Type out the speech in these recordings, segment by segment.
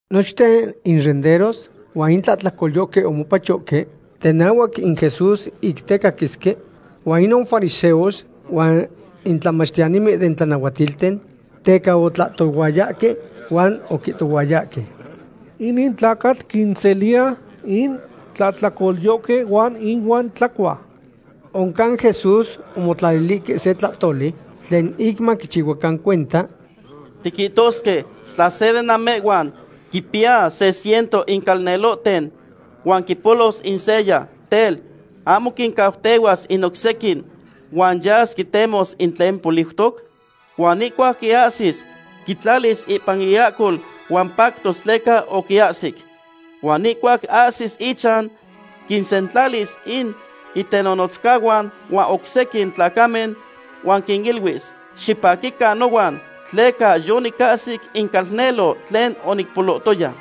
Nochten in renderos huan in tlahtlacolyohque omopachohque tenahuac in Jesús ic tecaquisque. Huan ic inon in fariseos huan in tlamachtiyanimen den tlanahuatilten teca otlahtohuayahque, huan oquihtohuayahque: ―Inin tlacatl quinseliya in tlahtlacolyohque huan inuan tlacua. Oncan Jesús omotlalilihque se tlahtoli tlen ic maquichihuacan cuenta: ―Tiquihtosque tla se de namehhuan quimpiya se ciento in calnelohten, huan quipolos in seya. Tel, ¿ahmo quincautehuas in oc sequin huan yas quitemos in tlen poliutoc? Huan ihcuac quiahsis, quitlalis ipan iahcol huan pactos tleca oquiahsic. Huan ihcuac ahsis ichan, quinsentlalis in itenonotzcahuan huan oc sequin tlacamen, huan quiniluis: “Xipaquican nohuan, tleca yonicahsic in calnelo tlen onicpolohtoya.”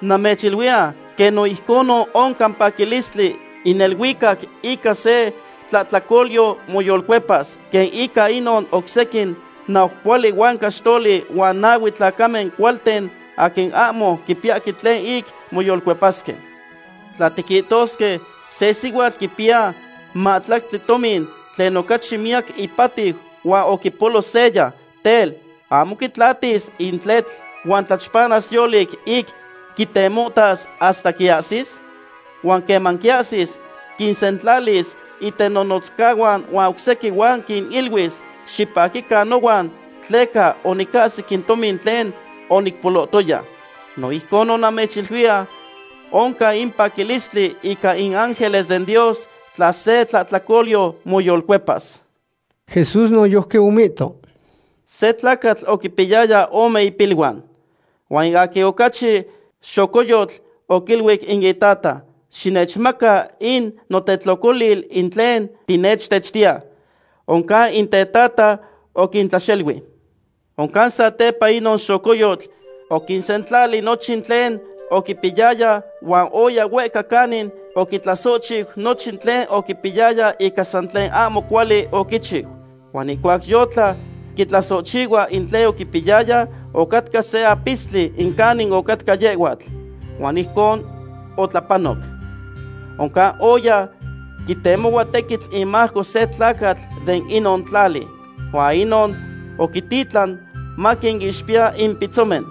Namechiluiya quen no ijconon oncan paquilistli in neluicac ica se tlahtlacolyo moyolcuepas, quen ica inon oc sequin naupohuali huan caxtoli huan nahue tlacamen cualten aquin ahmo quipiyahque tlen ic moyolcuepasque. ’Tla tiquihtosque se sihuatl quipiya mahtlactli tomin tlen ocachi miyac ipatiu huan oquipolo seya. Tel, ¿ahmo quitlatis in tletl huan tlachpantas yolic ic quitemohtas hasta quiahsis? Huan queman quiahsis, quinsentlalis itenonotzcahuan huan oc sequin huan quiniluis: “Xipaquican nohuan, tleca onicahsic in tomin tlen onicpolohtoya.” No ijcon namechiluiya oncan in paquilistli ica in ángeles den Dios tla se tlahtlacolyo moyolcuepas. Jesús noyojqui omihto: ―Se tlacatl oquimpiyaya ome ipiluan. Huan in aquin ocachi xocoyotl oquiluic in itata: “Xinechmaca in notetlocolil in tlen tinechtechtiya.” Oncan in tetata oquintlaxelui. Oncan satepa inon xocoyotl oquisentlali nochin tlen oquipiyaya huan oya huehca canin oquitlasohchiu nochin tlen oquipiyaya ica san tlen ahmo cuali oquichiu. Huan ihcuac yotla quitlasohchihua in tlen oquipiyaya, ocatca se apistli in canin ocatca yehhuatl. Huan ijcon otlapanoc. Oncan oya quitemohua tequitl inmajco se tlacatl de inon tlali. Huan inon oquititlan maquinixpiya in pitzomen.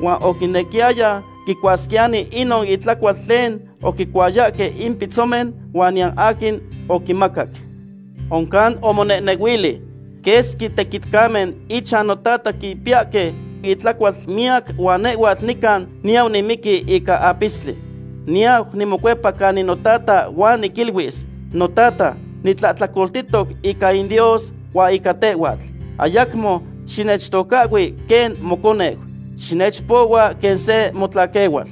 Huan oquinequiyaya quicuasquiyani inon intlacual tlen oquicuayahque in pitzomen, huan niyan aquin oquimacac. Oncan omonehnehuili: “¡Quesqui tequitcamen ichan notata quipiyahque intlacual miyac huan nehhuatl nican niyau nimiqui ica apistli! Niyau nimocuepa canica notata huan niquiluis: Notata, nitlahtlacoltihtoc ica in Dios huan ica tehhuatl; ayacmo xinechtocahhui quen moconeu. Xinechpohua quen se motlaquehual.”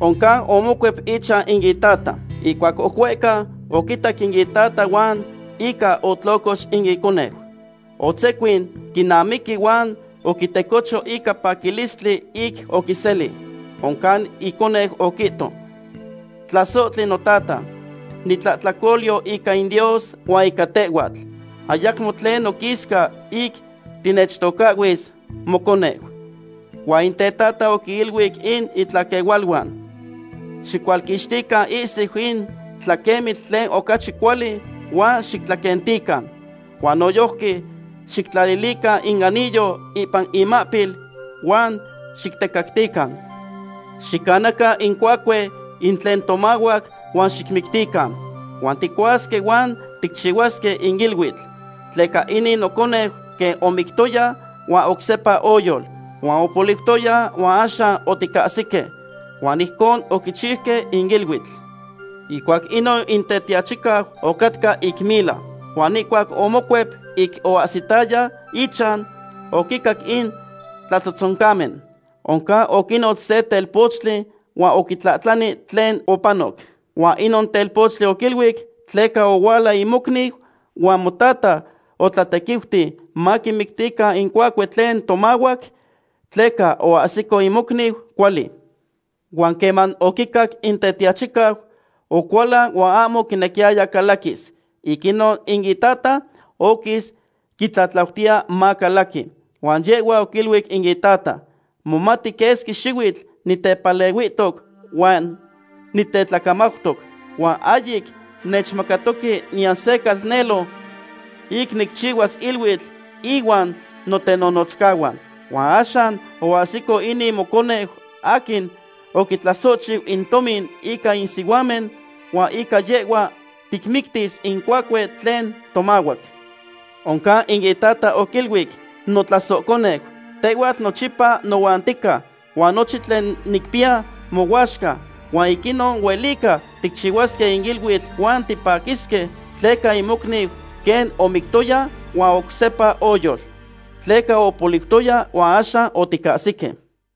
Oncan omocuep ichan in itata. ’Ihcuac oc huehca, oquitac in itata huan ica otlocox in iconeu. Otzecuin quinamiqui huan oquitecocho ica paquilistli ic oquiseli. Oncan in iconeu oquihto: “Tlasohtli notata, nitlahtlacolyo ica in Dios huan ica tehhuatl. Ayacmo tlen noquisca ic tinechtocahhuis moconeu.” Huan in tetata oquiniluic in itlaquehualuan: “Xicualquixtican ihsiu in tlaquemitl tlen ocachi cuali huan xitlaquentican. Huan noyojqui xictlalilican in anillo ipan imahpil, huan xictecactican. Xicanacan in cuacue in tlen tomahuac huan xicmictican. ¡Huan ticuasque huan ticchihuasque in iluitl! Tleca inin noconeu quen omictoya huan oc sepa oyol, huan opoliutoya huan axan oticahsique.” Huan ijcon oquichiuque in iluitl. ’Ihcuac inon in tetiachicau ocatca ic mila. Huan ihcuac omocuep ic oahsitaya ichan, oquincac in tlatzohtzoncamen. Oncan oquinotz se telpochtli huan oquitlahtlani tlen opanoc. Huan inon telpochtli oquiluic: “Tleca ohuala in mocniu huan motata otlatequiuti maquimictican in cuacue tlen tomahuac, tleca oahsico in mocniu cuali.” Huan quen oquicac in tetiachicau, ocualan huan ahmo oquinequiyaya calaquis. Ic inon in itata oquis quitlatlautiya macalaqui. Huan yehhua oquiluic in itata: “Momati quesqui xihuitl nitepalehuihtoc huan nitetlacamautoc, huan ahyic nechmacatoque niyan se calnelo ic nicchihuas iluitl ihuan notenonotzcahuan. Huan axan oahsico inin moconeu aquin oquitlasohchiu in tomin ica in sihuamen, huan ica yehhua ticmictis in cuacue tlen tomahuac.” Oncan in itata oquiluic: “Notlasohconeu, tehhuatl nochipa nohuan tica, huan nochin tlen nicpiya mohuaxca. Huan ic inon huelica ticchihuasque in iluitl huan tipaquisque, tleca in mocniu quen omictoya huan oc sepa oyol. Tleca opoliutoya huan axan oticahsique.”